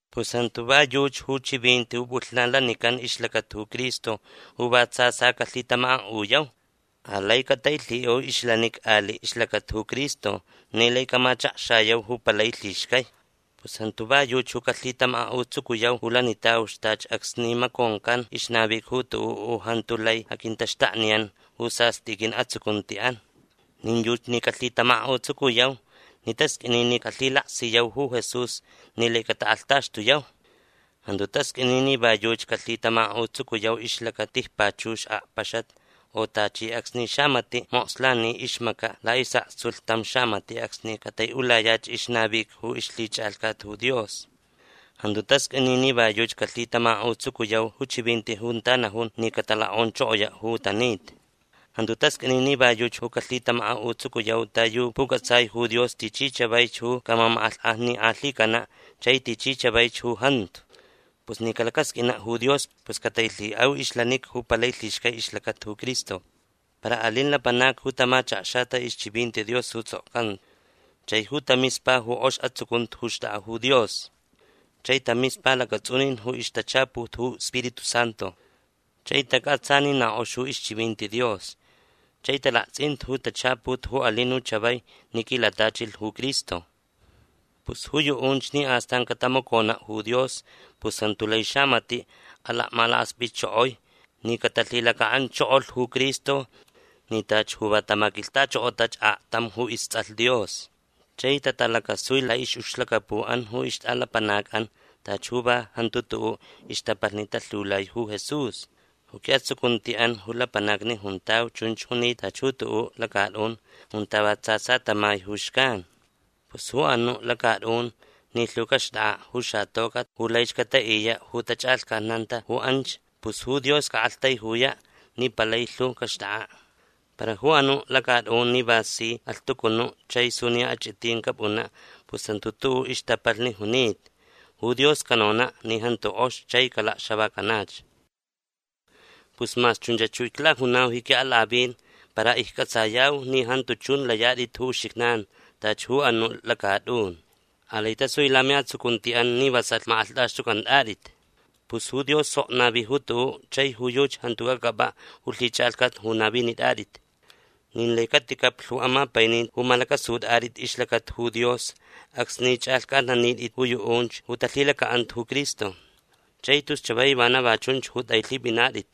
Pus jantu va yuchi ju chivinti ju pʼulhnan lanican ixlacata ju Cristo ju va tsa tsa calhitamakaʼuyau. Alai catailhiʼau ixlanica aliʼ ixlacata ju Cristo ni lai camachakxayau ju palai lhixcai. Pus jantu va yuchi ju calhitamakaʼutsucuyau ju lanitauch tachi acsni maconcan ixnavica ju tuʼuʼ ju jantu lai aquintaxtakniyan ju sastʼi quiʼatsucuntiʼan. Nin yuchi ni calhitamakaʼutsucuyau ni tasqʼuini ni calhilaksiyau ju Jesús ni lai catakʼalhtaxtuyau. Jantu tasqʼuini ni va yuchi calhitamakaʼutsucuyau ixlacata tijpachux akpaxat u tachi acsni xamatiʼ mokslani ixmacaʼ laʼisʼaktsulh tam xamatiʼ acsni cataiʼulayach ixnavica ju ixlhichʼalhcat ju Dios. Jantu tasqʼuini ni va yuchi calhitamakaʼutsucuyau ju chivinti junta najun ni catalokʼonchokoyaʼ ju tanita. Jantu tasqʼuini ni va yuchi ju calhitamakaʼutsucuyau ta yu pucʼatsai ju Dios tichi chavaich ju camamakʼalhkʼajnikʼalhicanaʼ chai tichi chavaich ju jantu. Pus ni calacasqʼuinaʼ ju Dios pus catailhiʼau ixlanica ju palai lhixcai ixlacata ju Cristo. Para alin lapanacni ju tamachakxata ixchivinti Dios ju tsʼokcanta chai ju tamispa ju kʼox atsucunti ju xtʼakʼa ju Dios chai tamispa lacatsʼunin ju ixtachaput ju Spiritu Santu. Chai tacʼatsa ni na kʼox ju ixchivinti Dios chai talaktsʼinta ju tachaput ju alin ju chavai ni quilatachilh ju Cristo. Pus ju yuʼunch ni astan catamaconaʼ ju Dios pus jantu lai xamatiʼ alakmalakaspʼitchokoi ni catalhilacaʼanchokolh ju Cristo ni tachi ju va tamaquilhtachokotach aktam ju istsʼalh Dios. Chai tatalacasui laʼixʼucxlacapuʼan ju ixtʼalapanacʼan tachi ju va jantu tuʼuʼ ixtapalhni talhiulai ju Jesús. Ju quiʼatsucuntiʼan ju lapanacni juntau chunch junita tachi ju tuʼuʼ lacatʼun junta va tsa tsa tamai ju xcan. Pus ju anuʼ lacatʼun ni lhu caxtʼakʼaʼ ju xatocʼat ju laich cataʼiyaʼ ju tachʼalhcatnanta ju anch pus ju Dios caʼaktaijuyaʼ ni palai lhu caxtʼakʼaʼ. Para ju anuʼ lacatʼun ni va si alhtucunuʼ chai suniya achʼitin capʼunaʼ pus jantu tuʼuʼ ixtapalhni junita. Ju Dios canonaʼ ni jantu kʼox chai calakxavacanach. Pus mas chunchach ju iclajunau ji quiʼalakʼavin para iccʼatsayau ni jantu chun layatʼit ju uxijnan tachi ju anuʼ lacatʼun. Alai tasui lamiʼatsucuntiʼan ni vasalh makʼalhtʼaxtʼucʼantʼatʼit. Pus ju Dios sok navi ju tuʼuʼ chai ju yuchi jantu cacʼapʼaʼ ju lhichʼalhcat ju navinitʼatʼit. Nin lai caticaplh ju amapaininti ju malacʼasutʼatʼit ixlacata ju Dios acsni chʼalhcʼatnanitʼit ju yuʼunch ju talhilacaʼanta ju Cristo. Chai tus chavai vana va chunch ju tʼailhipʼinatʼit.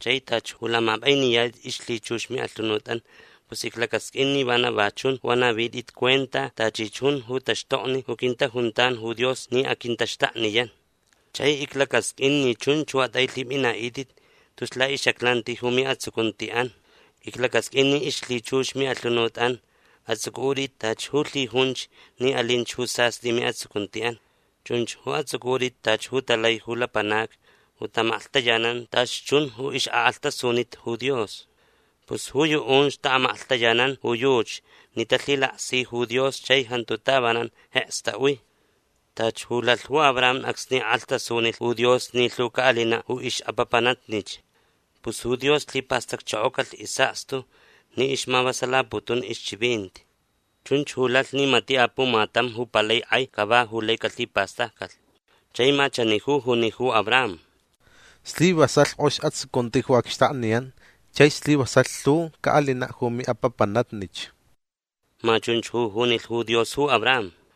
Chai tachi ju lamapʼainiyatʼit ixlhichux miʼalhunutʼan pus iclacasqʼuin ni vana va chun ju anavitʼit cuenta tachi chun ju taxtokni ju quintajuntan ju Dios ni aquintaxtakniyan. Chai iclacasqʼuin ni chunch ju atʼailhipʼinaʼitʼit tus laʼixʼaclanti ju miʼatsucuntiʼan. Iclacasqʼuin ni ixlhichux miʼalhunutʼan atsʼucʼutʼit tachi ju lhijunch ni alinch ju sastʼi miʼatsucuntiʼan. Chunch ju atsʼucʼutʼit tachi ju talai ju lapanacni ju taʼamaklhtayanan tachi chun ju ixʼakʼalhtasunita ju Dios. Pus ju yuʼunch taʼamaklhtayanan ju yuchi ni talhilaksi ju Dios chai jantu tavanan jeks taʼui. Tachi ju lalh ju Abraham acsni kʼalhtasunilh ju Dios ni lhu caʼalinaʼ ju ixʼapapanatnich. Pus ju Dios lhipastacchokocalh isʼakstu ni ixmavasalaputun ixchivinti. Chunch ju lalh ni matiʼ apumatam ju palai kʼai cava ju lai calhipastaccalh. Chai ma chani ju juni ju Abraham: “Slivasalh kʼox atsucunti ju acxtakniyan chai slivasalh lhu caʼalinaʼ ju miʼapapanatnich”. Ma chunch ju junilh ju Dios ju Abraham.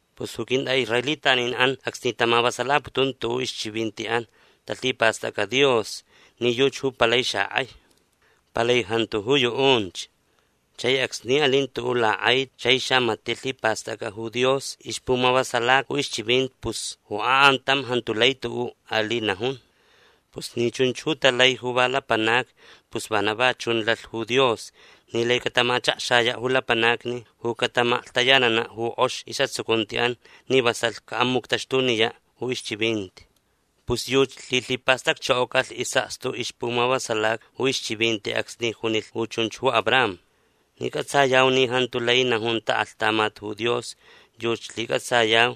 Pus ju quintʼaʼisraelitaninʼan acsni tamavasalaputun tuʼuʼ ixchivintiʼan talhipastʼacʼa Dios ni yuchi ju palai xakʼai. Palai jantu ju yuʼunch. Chai acsni alin tuʼuʼ lakʼaiti chai xamatiʼ lhipastʼacʼa ju Dios ixpumavasalaca ju ixchivinti pus ju akʼantam jantu lai tuʼuʼ aliʼ najun. Pus ni chunch ju talai ju va lapanacni pus vana va chun lalh ju Dios ni lai catamachakxayaʼ ju lapanacni ju cataʼamaklhtayananaʼ ju kʼox isʼatsucuntiʼan ni vasalh caʼamuctaxtuniyaʼ ju ixchivinti. Pus yuchi lhilhipastacchokocalh isʼakstu ixpumavasalaca ju ixchivinti acsni junilh ju chunch ju Abraham. Ni cʼatsayau ni jantu lai najun taʼaklhtamat ju Dios yuchi lhicʼatsayau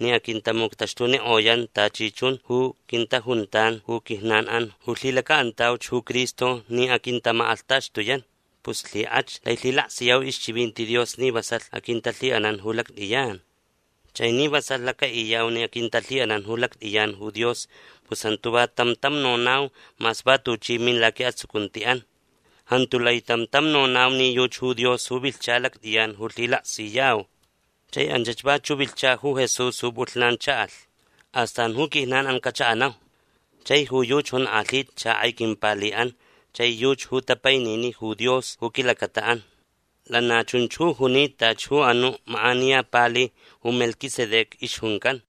ni aquintamuctaxtunikʼoyan tachi chun ju quintajuntan ju quijnanʼan ju lhilacaʼantauch ju Cristo ni aquintamakʼalhtaxtuyan. Pus lhikʼach lai lhilaksiyau ixchivinti Dios ni vasalh aquintalhiʼanan ju lactʼiyan. Chai ni vasalh lacaʼiyau ni aquintalhiʼanan ju lactʼiyan ju Dios pus jantu va tam tam nonau mas va tuchi min laquiʼatsucuntiʼan. Jantu lai tam tam nonau ni yuchi ju Dios ju vilhcha lactʼiyan ju lhilaksiyau. Chai anchach vachuʼ vilhcha ju Jesús ju pʼulhnan chaʼalh. Astan ju quijnanʼan cachaʼanau. Chai ju yuchi jonkʼalhita xakʼai quimpaliʼan chai yuchi ju tapainini ju Dios ju quilacataʼan. Lana chunch ju junita tachi ju anuʼ makʼaniya pali ju Melquisedec ixjuncan.